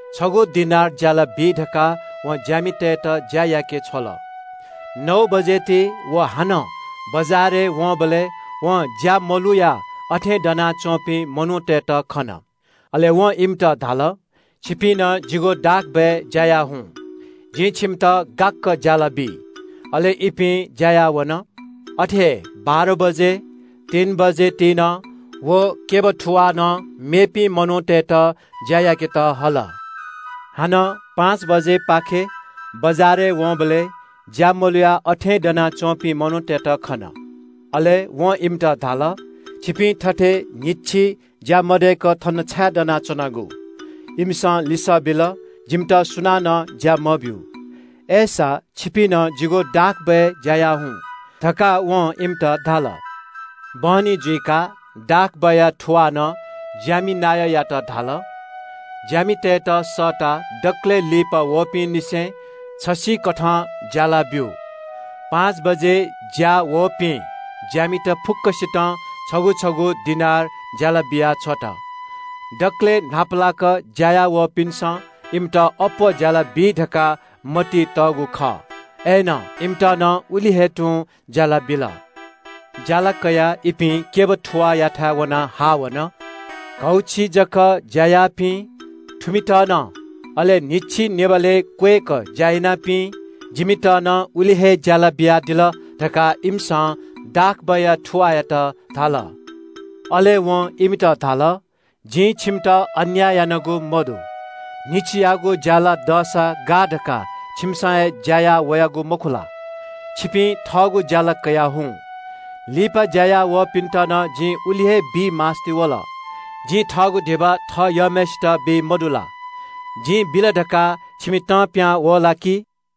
छगू दिनार ज्‍यालाबी धकाः वं ज्‍यामितय्‌त ज्‍या याके छ्वल। “नौ बजे ति व हानं बजारय् वंबलय् वं ज्‍या मलुयाः अथें दनाच्‍वंपिं मनूतय्‌त खन। अले वं इमित धाल – ‘छिपिं नं जिगु दाखक्‍यबय् ज्‍या याः हुँ। जिं छिमित गाक्‍क ज्‍यालाबी।’ अले इपिं ज्‍या याः वन। “अथे हे बाह्र बजे, तीन बजे ति नं व क्‍यब थुवालं मेपिं मनूतय्‌त ज्‍या याकेत हल। हानं पाँच बजेपाखे बजारय् वंबलय् ज्‍या मलुयाः अथें दनाच्‍वंपिं मनूतय्‌त खन। अले वं इमित धाल – ‘छिपिं थथे न्‍हिच्‍छि ज्‍या मदय्‌क थन छाय् दनाच्‍वनागु?’ “इमिसं लिसः बिल – ‘जिमित सुनानं ज्‍या मब्‍यू।’ “‘अय्‌सा, छिपिं नं जिगु दाखक्‍यबय् ज्‍या याः हुँ’ धकाः वं इमित धाल। “बहनी जुइकाः दाखक्‍यबया थुवालं ज्‍यामि नायःयात धाल – ‘ज्‍यामितय्‌त सःताः दकलय् लिपा वःपिंनिसें छसिकथं ज्‍याला ब्‍यु।’ पाँच बजे ज्‍यायावःपिं ज्‍यामित फुक्‍कसितं छगू छगू दिनार ज्‍याला बियाछ्वल। दकलय् न्‍हापालाक ज्‍या याः वःपिन्‍सं इमित अप्‍वः ज्‍यालाबी धकाः मतिइ तःगु खः। अय्‌नं इमित नं उलि हे तुं ज्‍याला बिल। ज्‍याला कयाः इपिं क्‍यबया थुवाःयाथाय् वनाः हाः वन। ‘घौछि जक ज्‍या याःपिं, थुमित नं, अले न्‍हिच्‍छि निभालय् क्‍वय्‌क ज्‍या यानापिं, जिमित नं उलि हे ज्‍याला बियादिल’ धकाः इमिसं दाखक्‍यबया थुवाःयात धाल। “अले वं इमित धाल – ‘जिं छिमित अन्‍याय यानागु मदु। न्‍हिच्‍छियागु ज्‍याला दःसा गाः धकाः छिमिसं हे ज्‍या याः वयागु मखु ला? छिपिं थःगु ज्‍याला कयाः हुँ। लिपा ज्‍या याःवःपिन्‍त नं जि उलि हे बी मास्‍ति वल। जिं थःगु धिबा थः यःम्‍हय्‌सित बी मदु ला? जिं बिल धकाः छिमि तं पिहां वः ला कि?’”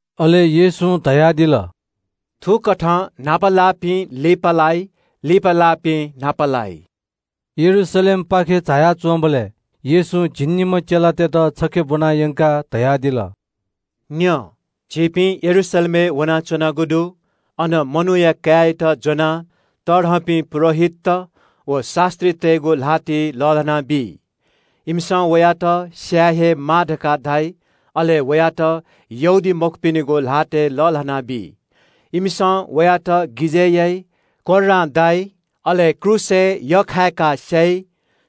अले येशूं धयादिल – “थुकथं न्‍हापा लाःपिं लिपालाइ, लिपा लाःपिं न्‍हापा लाइ।” यरूशलेमपाखे झाया च्‍वंबलय् येशूं झिंनिम्‍ह चेलातय्‌त छखे ब्‍वना यंकाः धयादिल। “न्‍यँ, झीपिं यरूशलेमय् वनाच्‍वनागु दु। अन मनूया काय्‌यात ज्‍वनाः तःधंपिं पुजाहारीत व शास्‍त्रीतय्‌गु ल्‍हातय् लःल्‍हानाबी। इमिसं वयात स्‍याये हे माः धकाः धाइ। अले वयात यहूदीमखुपिनिगु ल्‍हातय् लःल्‍हानाबी। इमिसं वयात गिजय् याइ, कोर्रां दाइ, अले क्रूसय् यख्‍खायाः स्‍याइ।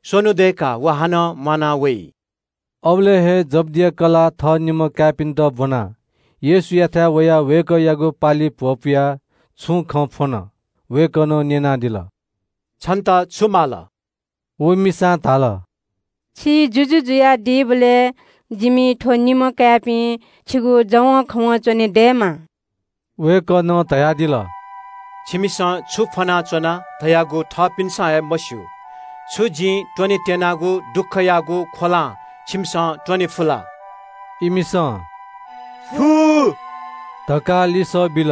स्‍वन्‍हु दय्‌काः व हानं म्‍वाना वइ।” अबलय् हे जब्‍दिया कलाः थः निम्‍ह काय्‌पिन्‍त ब्‍वनाः येशूयाथाय् वयाः वय्‌कःयागु पालिइ भ्‍वपुयाः छुं खँ फ्‍वन। वय्‌कलं न्‍यनादिल – “छन्‍त छु माल?” व मिसां धाल – “छि जुजु जुयादीबलय् जिमि थ्‍व निम्‍ह काय्‌पिं छिगु जवंखवं च्‍वनेदयेमा।” वय्‌कलं वया काय्‌पिन्‍त धयादिल, “छिमिसं छु फ्‍वनाच्‍वना धयागु थःपिन्‍सं हे मस्‍यू। छु जिं त्‍वनेत्‍यनागु दुःखयागु ख्‍वलां छिमिसं त्‍वने फु ला?” इमिसं “फु” धकाः लिसः बिल।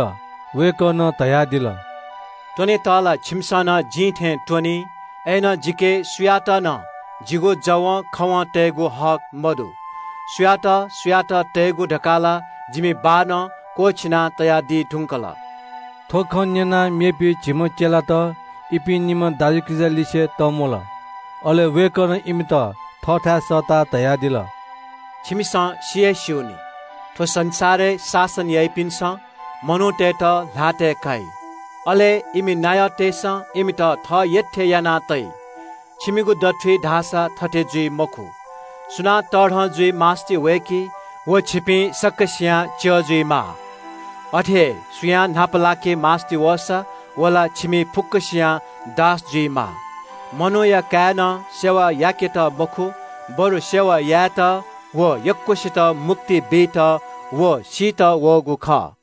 वय्‌कलं धयादिल – “त्‍वनेत ला छिमिसं नं जिं थें त्‍वनी। अय्‌नं जिके सुयात नं जिगु जवंखवं तयेगु हक मदु। सुयात सुयात तयेगु धकाः ला जिमि बाःनं क्‍वःछिना तयादी धुंकल।” थ्‍व खँ न्‍यनाः मेपिं झिम्‍ह चेलात इपिं निम्‍ह दाजुकिजा लिसे तंम्‍वल। अले वय्‌कलं इमित थःथाय् सःताः धयादिल – “छिमिसं सि हे स्‍यू नि – थ्‍व संसारय् शासन याइपिन्‍सं मनूतय्‌त ल्‍हातय् काइ। अले इमि नायःतय्‌सं इमित थः यःथें याना तइ। छिमिगु दथुइ धाःसा थथे जुइ मखु। सुनां तःधं जुइ मास्‍ति वय्‌की व छिपिं सकसियां च्‍यः जुइमाः। अथे हे सुयां न्‍हापालाके मास्‍ति वःसा व ला छिमि फुक्‍कसियां दास जुइमाः। मनूया काय्‌नं सेवा याकेत मखु, बरु सेवा यायेत व यक्‍वसित मुक्ति बीत व सीत वःगु खः।”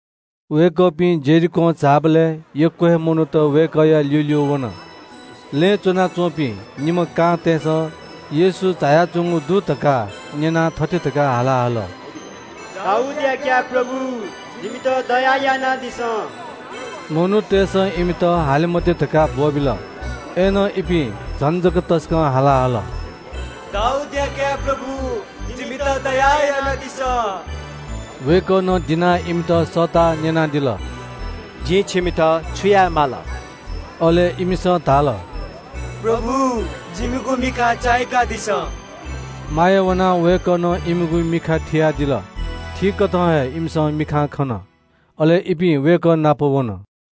वय्‌कःपिं यरीहों झाःबलय् यक्‍व हे मनूत वय्‌कःया ल्‍यूल्‍यू वन। लँय् च्‍वनाच्‍वंपिं निम्‍ह कांतय्‌सं येशू झायाच्‍वंगु दु धकाः न्‍यनाः थथे धकाः हाला हल – “दाऊदया काय् प्रभु, जिमित दया यानादिसँ।” मनूतय्‌सं इमित हाले मते धकाः ब्‍वःबिल। अय्‌नं इपिं झन जक तसकं हाला हल – “दाऊदया काय् प्रभु, जिमित दया यानादिसँ।” वय्‌कलं दिनाः इमित सःताः न्‍यनादिल – “जिं छिमित छु याये माल?” अले इमिसं धाल – “प्रभु, जिमिगु मिखा चाय्‌कादिसँ।” माया वनाः वय्‌कलं इमिगु मिखाय्‌ थियादिल। थीकथं हे इमिसं मिखां खन। अले इपिं वय्‌कः नाप वन।